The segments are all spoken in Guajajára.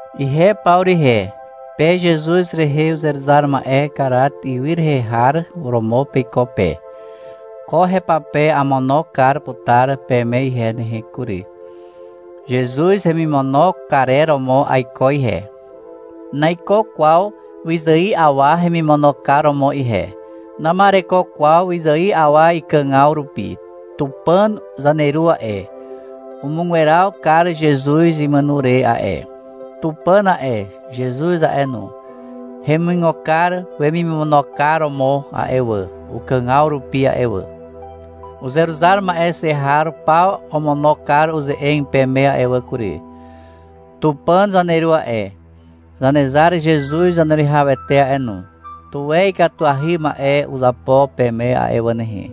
Ihe Pawru ihe, pe Zezuz rehe uzeruzar ma'e Karat ywy rehe har romo peiko pe. Ko hepape amono kar putar peme ihe nehe kury. Zezuz hemimono karer romo aiko ihe. Naiko kwaw wyzài awa hemimono kar romo ihe. Nama'ereko kwaw wyzài awa ikàgaw rupi. Tupàn zaneru a'e, umugweraw kar Zezuz imàno re a'e. Tupàn a'e, Zezuz a'e no, hemuigo kar wemimono kar romo a'e wà, ukàgaw rupi a'e wà. Uzeruzar ma'e xe har paw omono kar uze'eg peme a'e wà kury. Tupàn zaneru a'e, Zanezar Zezuz Zaneruwihawete a'e no, tuwe ikatuahy ma'e uzapo peme a'e wà nehe,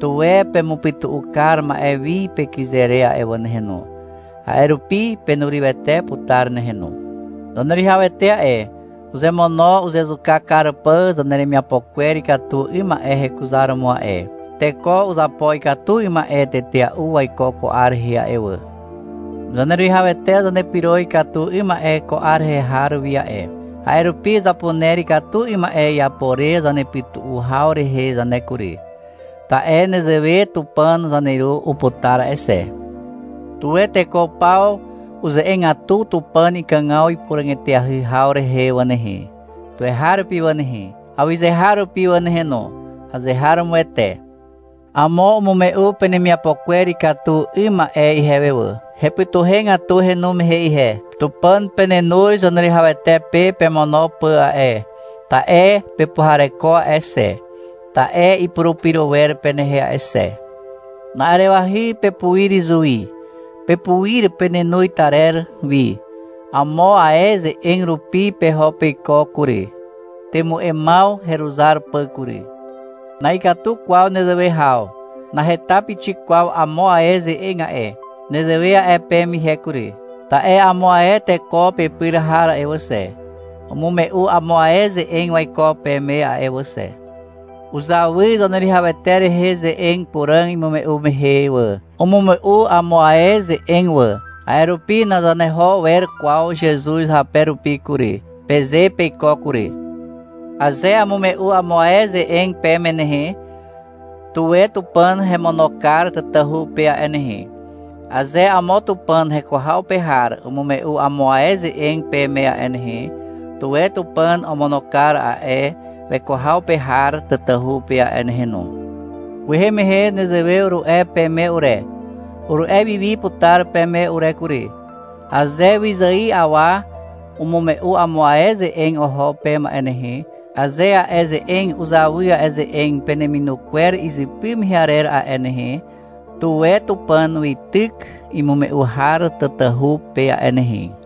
tuwe pemupytu'u kar ma'e wi pekyze re a'e wà nehe no. A'e rupi penurywete putar nehe no. Zaneruwihawete a'e, uzemono uzezuka kar pà zaneremiapo kwer ikatu 'ym ma'e hekuzaromo a'e. Teko uzapo ikatu 'ym ma'e tetea'u waiko ko 'ar rehe a'e wà. Zaneruwihawete zanepyro ikatu 'ym ma'e ko 'ar rehe har wi a'e. A'e rupi zapuner ikatu 'ym ma'e iapo re zanepytu'u haw rehe zane kury. Ta'e nezewe Tupàn zaneru uputar a'e xe. Tuwe teko paw uze'egatu Tupàn ikàgaw ipuràg eteahy haw rehe wà nehe, tuweharupi wà nehe, awyzeharupi wà nehe no. Azeharomoete. Amo umume'u penemiapo kwer ikatu 'ym ma'e ihewe wà. Hepytuhegatu henu mehe ihe. Tupàn penenoz Zaneruwihawete pe pemono pà a'e, ta'e pepuhareko a'e xe, ta'e ipurupyro wer penehe a'e xe. Na'arewahy pepuir izuwi, pepuir penenoz tarer wi. Amo ae ze'eg rupi peho peiko kury. Temu'emaw heruzar pà kury. Na'ikatu kwaw nezewe haw. Naheta pixik kwaw amo ae ze'eg a'e. Nezewe a'e peme ihe kury, ta'e amo ae teko pepyr har a'e wà xe, umume'u amo ae ze'eg waiko peme a'e wà xe. Uzawy Zaneruwihawete rehe ze'eg puràg imume'u mehe wà. Umume'u amo ae ze'eg wà. A'e rupi — Nazaneho wer kwaw Zezuz hape rupi kury, peze peiko kury. Aze amume'u amo ae ze'eg peme nehe, tuwe Tupàn hemono kar tatahu pe a'e nehe. Aze amo Tupàn heko haw pe har umume'u amo ae ze'eg peme a'e nehe, tuwe Tupàn omono kar a'e weko haw pe har tatahu pe a'e nehe no. Kwehe mehe nezewe uru'e peme ure. Uru'e wi wi putar peme ure kury. Aze wyzài awa umume'u amo ae ze'eg oho peme a'e nehe, aze a'e ze'eg uzawy a'e ze'eg peneminu kwer izypy mehe arer a'e nehe, tuwe Tupàn weityk imume'u har tatahu pe a'e nehe.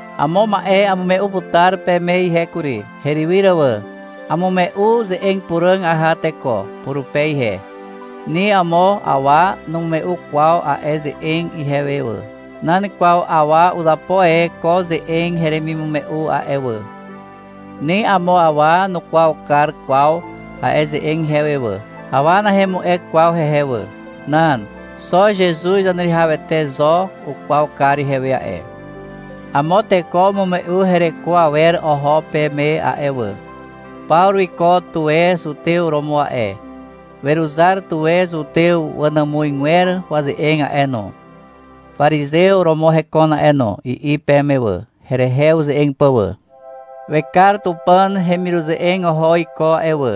Amo ma'e amume'u putar peme ihe kury, herywyr wà. Amume'u ze'eg puràg aha teko purupe ihe. Ni amo awa numume'u kwaw a'e ze'eg ihewe wà. Nan kwaw awa uzapo e ko ze'eg heremimume'u a'e wà. Ni amo awa nukwaw kar kwaw a'e ze'eg ihewe wà. Awa nahemu'e kwaw hehe wà. Nan. Xo Zezuz Zaneruwihawete zo ukwaw kar ihewe a'e. Amo teko umume'u hereko awer oho peme a'e wà. — Pawru wiko tuwe zutew romo a'e. Weruzar tuwe zutew wanàmuzgwer waze'eg a'e no. Parizew romo hekon a'e no, i'i peme wà, herehe uze'eg pà wà. — Wekar Tupàn hemiruze'eg oho iko a'e wà,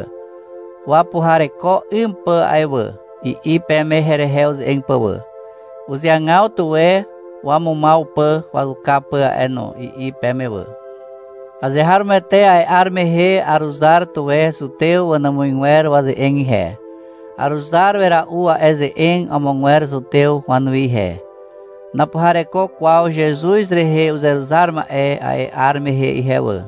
wapuhareko 'ym pà a'e wà, i'i peme herehe uze'eg pà wà. — Uzeagaw tuwe wamumaw pà wazuka pà a'e no, i'i peme wà. Azeharomoete a'e 'ar mehe aruzar tuwe zutew wanàmuzgwer waze'eg ihe. Aruzar wera'u a'e ze'eg amogwer zutew wanuwi ihe. (Napuhareko kwaw Zezuz rehe uzeruzar ma'e a'e 'ar mehe ihe wà.)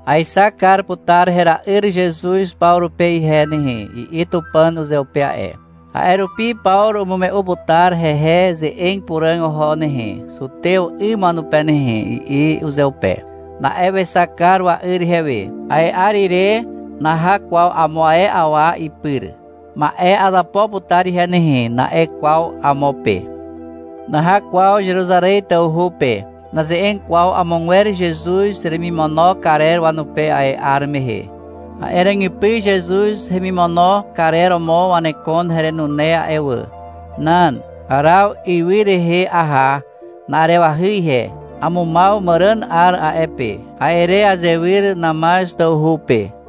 — Aexak kar putar hera'yr Zezuz Pawru pe ihe nehe, i'i Tupàn uzeupe a'e. — A'e rupi Pawru umume'u putar hehe ze'eg puràg oho nehe, zutew 'ym wanupe nehe, i'i uzeupe. Na'e wexak kar wa'yr ihewe. A'e 'ar ire naha kwaw amo ae awa ipyr. — Ma'e azapo putar ihe nehe, na'e kwaw amo pe. Naha kwaw Zeruzarez tawhu pe. Naze'eg kwaw amogwer Zezuz hemimono karer wanupe a'e 'ar mehe. (A'e ràgypy Zezuz hemimono karer romo wanekon herenune a'e wà.) Nan. Araw ywy rehe aha na'arewahy ihe. Amumaw màràn 'ar a'e pe. A'e re azewyr Namaz tawhu pe.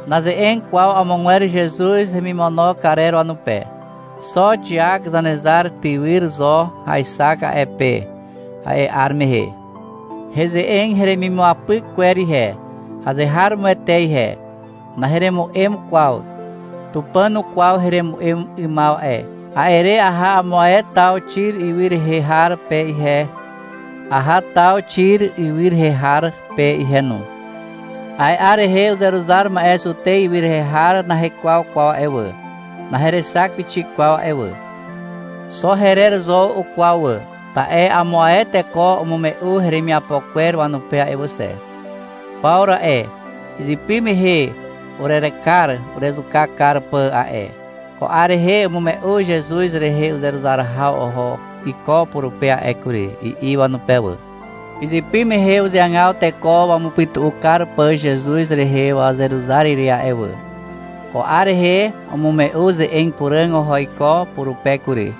Naze'eg kwaw amogwer Zezuz hemimono karer wanupe. Xo Xiak Zanezar tywyr zo aexak a'e pe, a'e 'ar mehe. Heze'eg heremimuapyk kwer ihe, azeharomoete ihe. Naheremu'em kwaw. Tupàn ukwaw heremu'em 'ymaw a'e. A'e re aha amo ae taw Xir ywy rehe har pe ihe, aha taw Xiri ywy rehe har pe ihe no. A'e 'ar rehe uzeruzar ma'e Zutez ywy rehe har nahekwaw kwaw a'e wà, naherexak pixik kwaw a'e wà. Xo herer zo ukwaw wà, ta'e amo ae teko umume'u heremiapo kwer wanupe a'e wà xe. — Pawru a'e, izypy mehe urerekar urezuka kar pà a'e. Ko 'ar rehe umume'u Zezuz rehe uzeruzar haw oho iko purupe a'e kury, i'i wanupe wà. — Izypy mehe uzeagaw teko wamupytu'u kar pà Zezuz rehe wazeruzar ire a'e wà. Ko 'ar rehe umume'u ze'eg puràg oho iko purupe kury,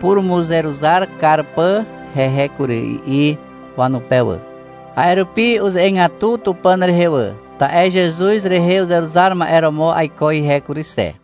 purumuzeruzar kar pà hehe kury, i'i wanupe wà. A'e rupi uze'egatu Tupàn rehe wà, ta'e Zezuz rehe uzeruzar ma'e romo aiko ihe kury xe.